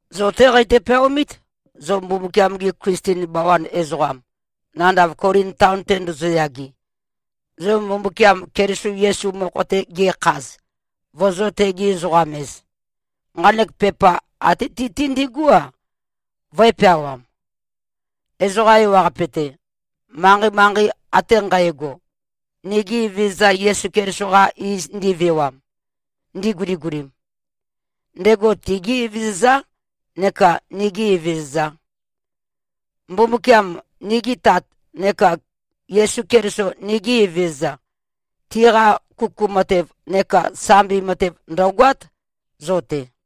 Zo-té qeitø-peaomít, zo Mbumbukiam-gi Klisten bawan ezoqam, nandav Kolin taon-te ndozoyage, zo Mbumbukiam Keliso Yesu mokho-te ge꞉khaz, vozō-tegi-ezoqam-ez. Nqanek pepa até ti-té ndigú-a, vǿe-peawām, ezoqa ewaqape-te, manqei-manqei ate nqægo, nigi Evezøza Yesu Keliso-qa iz ndivewam, ndiguligulim. Ndego tigí Evezøzá neka nigī Evezøzā. Mbumbukiam, nigi Tat, neka Yesu Keliso, nigi Evezøza, tiqa kuku matev neka sambi matev ndø̀goát, zo-te.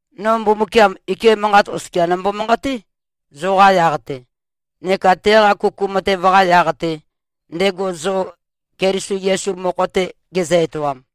No Mbumbukiam, ike manqat oskia nombo-manqaté, zoqa yaq-te, neka teqa kuku matev-qa yaq-te, ndego zo Keliso Yesu mokho-te gezø-etoam.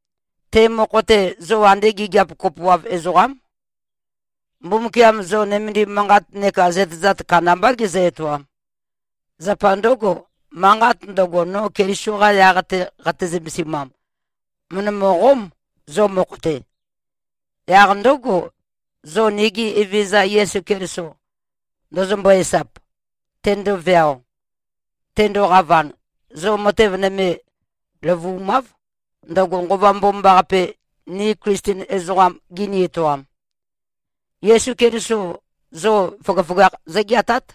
Te mokho-te, zo andé gigiap kopoav ezoqám. Mbumbukiam zo nømendim manqat neka zøtezat kandambá gezø-etoam. Zapa ndǿgo, manqat ndøgo, no Keliso-qa yaq-te qate-zømesimam, mø̀ndømø-qóm, zo mokho-te. Yaq ndǿgo, zo nigi Evezøza Yesu Keliso ndøzømbøe-esap, tendoveao, tendoqavan, zo matev nøme løvu꞉máv, ndøgo Nqova Mbomambaqape, ni Klisten ezoqam ngini-etoam. Yesu Keliso zo føgøføgakh zǿgeatát.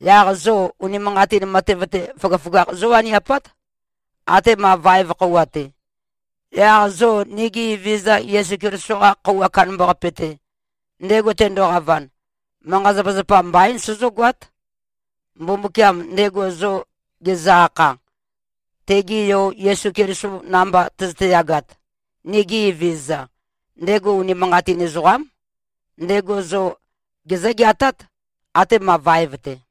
Yaq zo unimanqatin matev-te, føgøføgakh zówaniapát, atema vaev khøuwa-te. Yaq zo nigi Evezøza Yesu Keliso-qa Khøuwa Kandambaqape-te, ndego tendoqavan, manqa-zapazapa mbaín, sozógoát. Mbumbukiam, ndego zo gezø-akha, tege Yo Yesu Keliso namba tøzøte-yagat, nigi Evezøza, ndego unimanqatin ezoqám. Ndego zo gezǿ-geatát, atema vaev-te.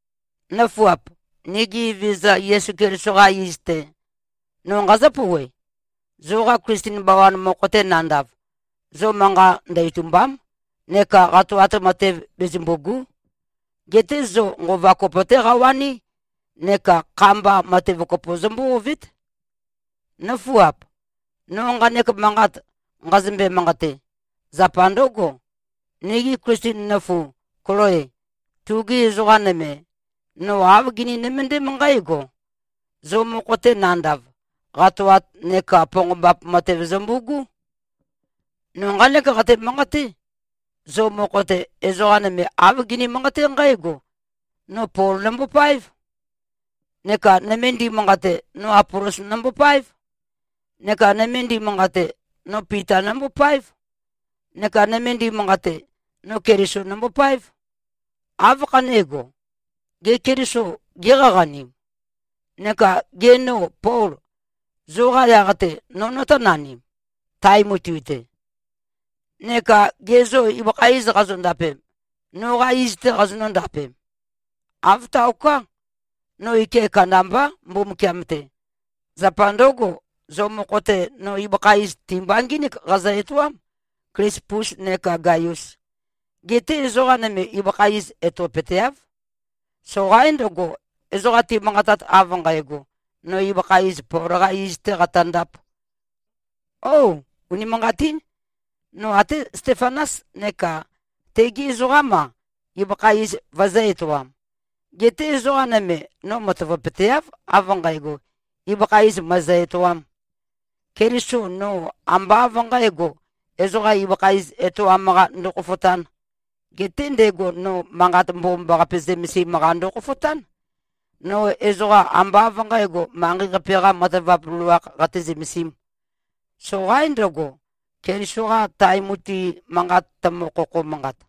Nǿfuap! Nigi Evezøza Yesu Keliso-qa iz-te, no nqazǿ-pouwe: Zoqa Klisten bawan mokho-te nandav, zo manqa ndø-itùmba᷄m neka qatoat matev bezømbù꞉gu᷄. Geté zo nqova kopo-té qawaní, neka kha-mba, matev kopo zombó-ovét. Nǿfuap! No nqanek manqat nqazømbe-manqate, zapa ndǿgo: Nigu Klisten nøfu Kloe, tugi ezoqa nøme, no āv gini-nømøndém nqǽgo: Zo mokho-te nandav, qatoat neka ponqombap matev zømbu꞉gú. No nqánek qate-manqaté: Zo mokho-te, ezoqa nøme, āv gini-manqaté nqǽgo, “No Pol nombopáev,” neka nøme ndimanqate, “No Apolos nombopáev,” neka nøme ndimanqate, “No Pita nombopáev,” neka nøme ndimanqate, “No Keliso nombopáev.” Áv khané꞉go? Gê, Keliso géqaqanim? Neka gê, no Pol, zoqa yaq-te no notónanim, tae mutui-te? Neka gê, zo ibøkha iz qazondapem, noqā iz-tē qazonǿ-ndapem? Āv taoká. No ike kandambá, Mbumbukiam-te. Zapa ndǿgo, zo mokho-te, no ibøkha iz, ti-mba ngínik qazø-etoám, Klispus neka Gaius. Geté ezoqa nøme, ibøkha iz etopøteáv. Soqaín ndøgo, ezoqa timanqatat, av nqægo, “No ibøkha iz, Pol-qā iz-tē qatøndāp.” Ó! Unimanqatín. No até Stefanas neka tegi ezoqám-a, ibøkha iz vøezø̄-etoam. Geté ezoqa nøme, no matavapøteáv, av nqægo, ibøkha iz mø̀ezø-etoām. Keliso no ambá av nqǣgo, ezoqa ibøkha iz etoam-qa ndokhofotān. Geté ndego no Manqat Mbomambaqape zømesim-qa ndokhofotán. No ezoqa ambá av nqǣgo, manqei-qape-qā matavap loloākh qate-zømesīm. Soqaín ndøgo, Keliso-qa tae mutui manqat, tømø-khokho-manqat.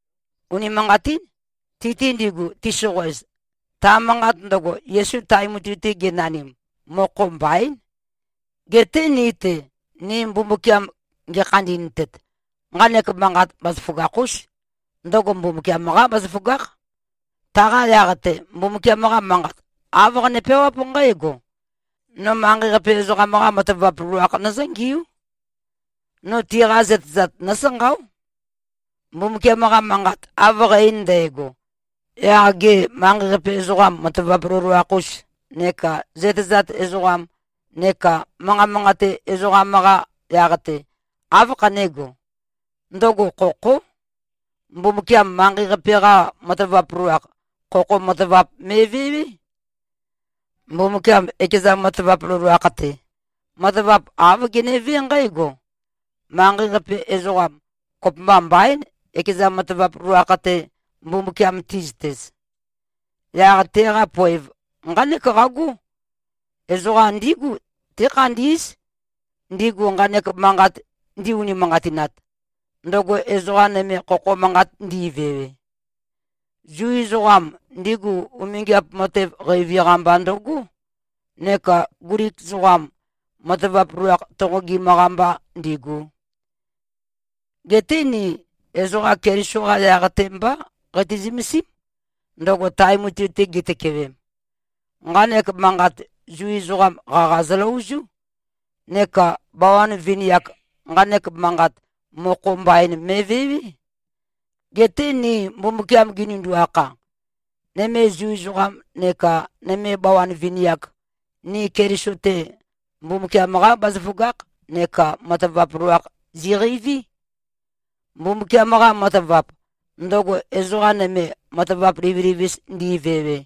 Unimanqatín. Ti-te ndigu, tisoqoez, ta manqat ndøgo, Yesu tae mutui-te genanim, mokho mbaín. Geté ni-te, ni Mbumbukiam ngekhandi꞉ntet, nqanek manqat, bazaføgakh-ús. Ndøgo Mbumbukiam-qá bazaføgákh. Taqa yaq-te, Mbumbukiam-qa Manqat, āv qane-peawáp nqǽgo, “No manqei-qape ezoqam-qa matavap loloakh nøzǿngiú. No tiqa zøtezat nósanqáo.” Mbumbukiam-qa manqat av qæ-ein ndægo, yaq gê, manqei-qape ezoqam matavap loloakh-us neka zøtezat ezoqam neka manqa manqate ezoqam-qa yaq-te, áv khané꞉go? Ndøgo khokhó. Mbumbukiam manqei-qape-qa matavap loloakh, khokho matavap me꞉vewé. Mbumbukiam ekeza matavap loloakh-te, matavap āv genevé nqǽgo: Manqei-qape ezoqam, kopømba mbaín, ekeza matavap loloakh-te, Mbumbukiam ti꞉zøtez. Yaq teqa poev nqánek qagó: Ezoqa ndígu tékhandí꞉z, ndigu nqanek manqat ndi-unimanqatinat, ndøgo ezoqa nøme khokho manqat ndi꞉vewe. Zu ezoqam, ndigu umingiap matev qeivi-qa mba ndøgó, neka Glik ezoqam, matavap loloakh tonqogim-qa mbá ndīḡū. Geté ni ezoqa Keliso-qá yaq-te mbá qati-zømesím, ndego tae mutui-te gitøkewem. Nqanek manqat, Zu ezoqam, qaqa zøløozú. Neka bawan vini-ak, nqanek manqat, mokho mbain me꞉vewé. Geté ni Mbumbukiam ginindu-akha, nøme Zu ezoqam neka nøme bawan vini-ak, ni Keliso-te, Mbumbukiam-qá bazaføgakh neka matavap loloakh ziqeiví. Mbumbukiam-qa matavap, ndøgo ezoqa nøme matavap livilivis ndi꞉vewe,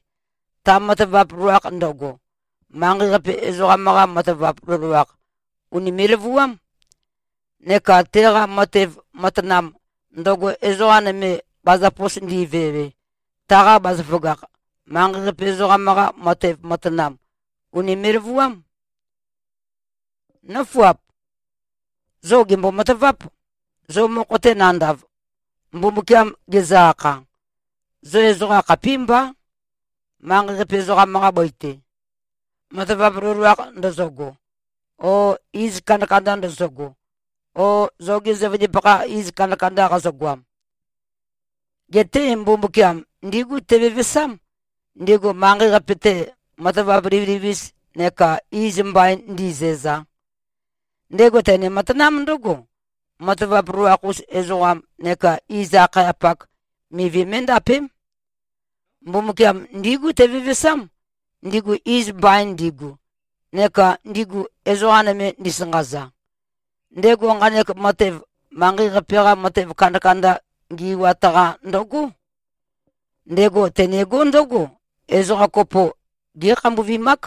ta matavap loloakh ndøgo, manqei-qape ezoqam-qa matavap loloakh, ùnime꞉-løvuám. Neka teqa matev matanam, ndøgo ezoqa nøme bazapos ndi꞉vewe, taqa bazaføgakh, manqei-qape ezoqam-qa matev matanam, ùnime꞉-løvuám. Nǿfuap! Zo gèmbo-mataváp. Zo mokho-te nandav, Mbumbukiam gezø-akha, zo ezoqa khapímbá, manqei-qape ezoqam-qa bøi-te, matavap loloakh ndøzøgo o iz kandakanda ndøzøgo o zogi zøvøndipakha iz kandakanda qazøgoam. Geté Mbumbukiam ndígu tevevesám, ndigu manqei-qape-te, matavap livilivis neka iz mbain ndi꞉zæza. Ndego tene-matanám ndǿgo: Matavap loloakh-us ezoqam neka iz-akhayapak, mivi mé꞉ndapém. Mbumbukiam ndígu tevevesám, ndigu iz mbain ndigu, neka ndigu, ezoqa nøme ndisanqaza. Ndego nqanek matev, manqei-qape-qa matev kandakanda ngi꞉wat-qa ndøgó. Ndego tenegó ndǿgo: Ezoqa kopo, gé꞉khambuvimák,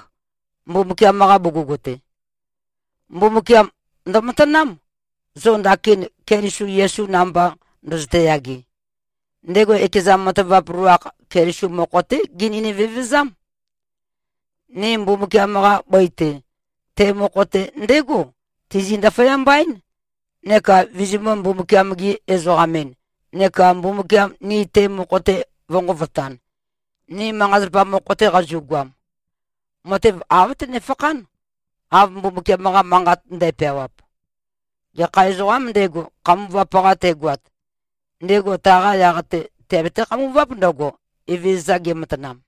Mbumbukiam-qa bugug-te. Mbumbukiam ndømatanám, zo ndakin Keliso Yesu namba, ndøzøte-yage. Ndego ekeza matavap loloakh, Keliso mokho-té genøni-vevezám. Ni Mbumbukiam-qa bøi-te, te mokho-te ndégo tizi-ndaføyamba-én, neka vizimø̄-Mbumbukiam-gi-ezoqam-en neka Mbumbukiam ni te mokho-te vø̄nqovotan, ni manqa-zapa mokho-te qazu꞉goam. Matev av tønefakhán, av Mbumbukiam-qa Manqat ndæpeawap, “Gekha ezoqām ndego, khambuvap-qa tegoat, ndego taqa yaq-te teabete-khambuváp ndǿgo, Evezøza gematanam.”